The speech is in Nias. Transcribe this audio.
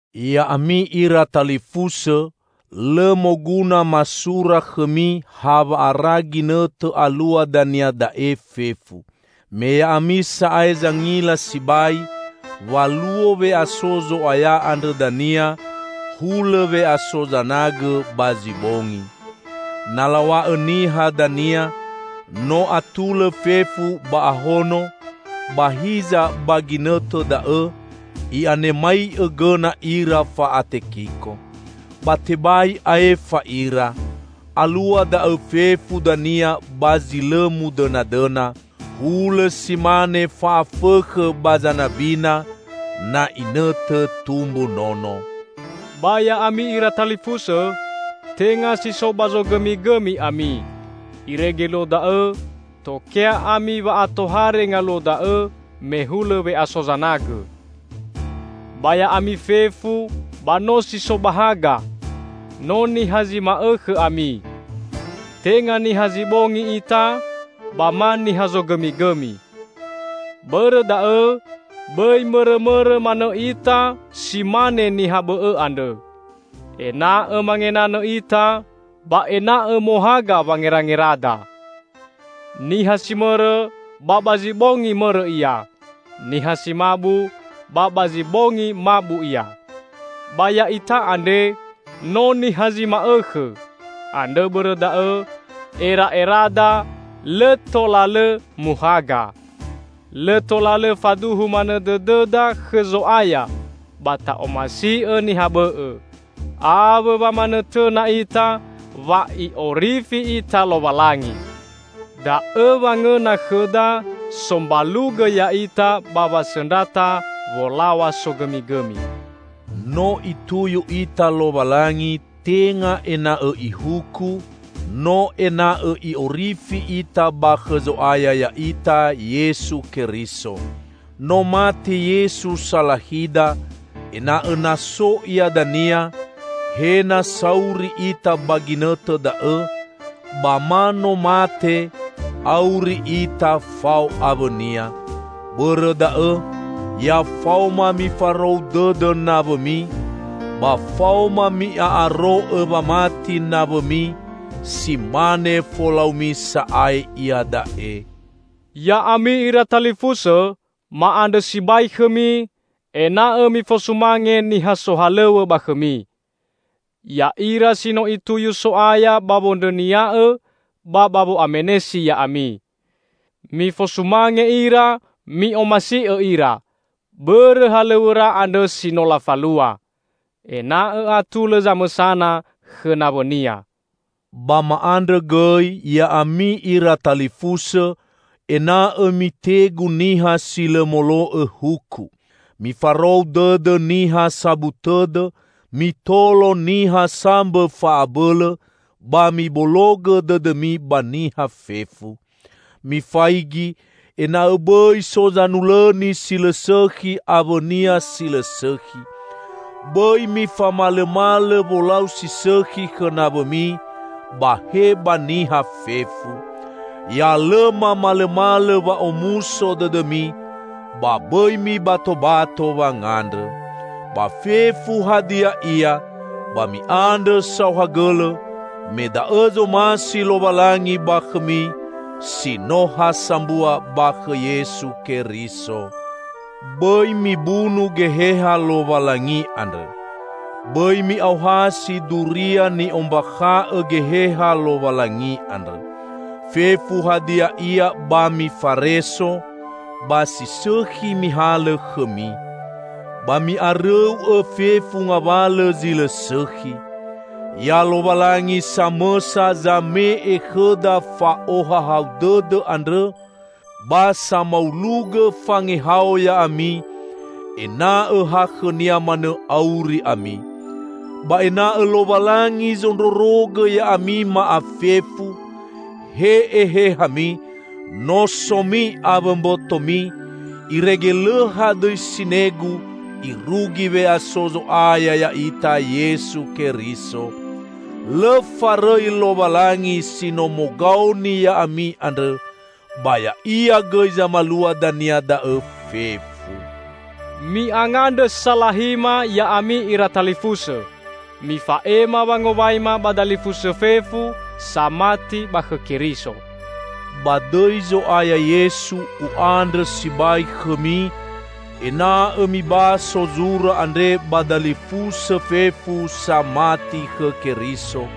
Ya'ami ira talifusõ, lõ moguna masura khõmi hawa'ara ginõtõ alua dania da'e fefu. Me ya'ami sa'ae zangila sibai, wa luo we'aso Zo'aya andrõ dania hulõ we'aso zanagõ ba zi bongi. Na law̃a'õ niha dania, "No atulõ fefu ba ahono," ba hiza ba ginõtõ da'õ i'anemai'õ gõna ira fa'atekiko! Ba tebai aefa ira. Alua da'õ fefu dania ba zi lõ mudõnadõna, hulõ si mane fa'afõkhõ ba zanabina na inõtõ tumbu nono. Ba ya'ami ira talifusõ, tenga si so ba zogõmigõmi ami, irege luo da'õ tokea ami wa'atohare ngaluo da'õ me hulõ we'aso zanagõ. Ba ya'ami fefu ba no si so ba haga; no niha zi ma'õkhõ ami. Tenga niha zi bongi ita, ba ma niha zogõmigõmi. Bõrõ da'õ bõi mõrõmõrõ manõ ita si mane niha bõ'õ andrõ. Ena'õ mangenanõ ita, ba ena'õ mohaga wangerangerada. Niha si mõrõ, ba ba zi bongi mõrõ ia. Niha si mabu, ba ba zi bongi mabu ia. Ba ya'ita andre no niha zi ma'õkhõ, andrõ bõrõ da'õ era'erada lõ tola lõ muhaga. Lõ tola lõ faduhu manõ dõdõda khõ Zo'aya ba ta'omasi'õ niha bõ'õ, awõ wa manõtõna ita wa I'orifi ita Lowalangi. Da'õ wangõna khõda sombalugõ ya'ita ba wasõndrata wolaw̃a sogõmigõmi. No Ituyu ita Lowalangi tenga ena'õ Ihuku, no ena'õ I'orifi ita ba khõ Zo'aya ya'ita, Yesu Keriso. No mate Yesu salahida, ena'õ na so Ia dania -- he na sauri ita ba ginõtõ da'õ, ba ma no mate -- auri ita fao awõ-Nia. Bõrõ da'õ ya faoma mifarou dõdõ nawõmi ba faoma mi'a'aro'õ wamati nawõmi, si mane folaumi sa'ae iada'e. Ya'ami ira talifusõ, ma'andrõ sibai khõmi, ena'õ mifosumange niha sohalõw̃õ ba khõmi; ya'ira si no Ituyu So'aya ba wondrõnia'õ, ba ba wo'amenesi ya'ami. Mifosumange ira, mi'omasi'õ ira, bõrõ halõw̃õra andrõ si no lafalua. Ena'õ atulõ zamõsana khõ nawõnia. Ba ma'andrõ gõi, ya'ami ira talifusõ, ena'õ mitegu niha si lõ molo'õ huku. Mifarou dõdõ niha sabu tõdõ, mitolo niha sambõ fa'abõlõ, ba mibologõ dõdõmi ba niha fefu. Mifaigi, ena'õ bõi so zanulõni si lõ sõkhi awõnia si lõ sõkhi. Bõi mifamalõmalõ wolau si sõkhi khõ nawõmi, ba he ba niha fefu. Ya lõ mamalõmalõ wa'omuso dõdõmi, ba bõi mibatobato wangandrõ. Ba fefu hadia ia, ba mi'andrõ saohagõlõ, me da'õ zomasi Lowalangi ba khõmi, si no ha sambua ba khõ Yesu Keriso. Bõi mibunu Geheha Lowalangi andrõ. Bõi mi'aohasi duria ni'ombakha'õ Geheha Lowalangi andrõ. Fefu hadia ia ba mifareso, ba si sõkhi mihalõ khõmi. Ba mi'arõu'õ fefu ngawalõ zi lõ sõkhi. Ya Lowalangi samõsa zame'e khõda fa'ohahau dõdõ andrõ, ba samaulugõ fangehao ya'ami, ena'õ ha khõ-Nia manõ auri ami. Ba ena'õ Lowalangi zondrorogõ ya'ami ma'afefu, he ehehami, nosomi awõ mbotomi, irege lõ hadõi sinegu irugi we'aso Zo'aya ya'ita Yesu Keriso. Lõ farõi Lowalangi si no mogaoni ya'ami andrõ, ba Ya'ia gõi zamalua dania da'õ fefu. Mi'angandrõ salahima, ya'ami ira talifusõ! Mifa'ema wangowaima ba dalifusõ fefu, samati ba khõ Keriso. Ba dõi Zo'aya Yesu, u'andrõ sibai khõmi, ena'õ mibaso zura andre ba dalifusõ fefu, samati khõ Keriso.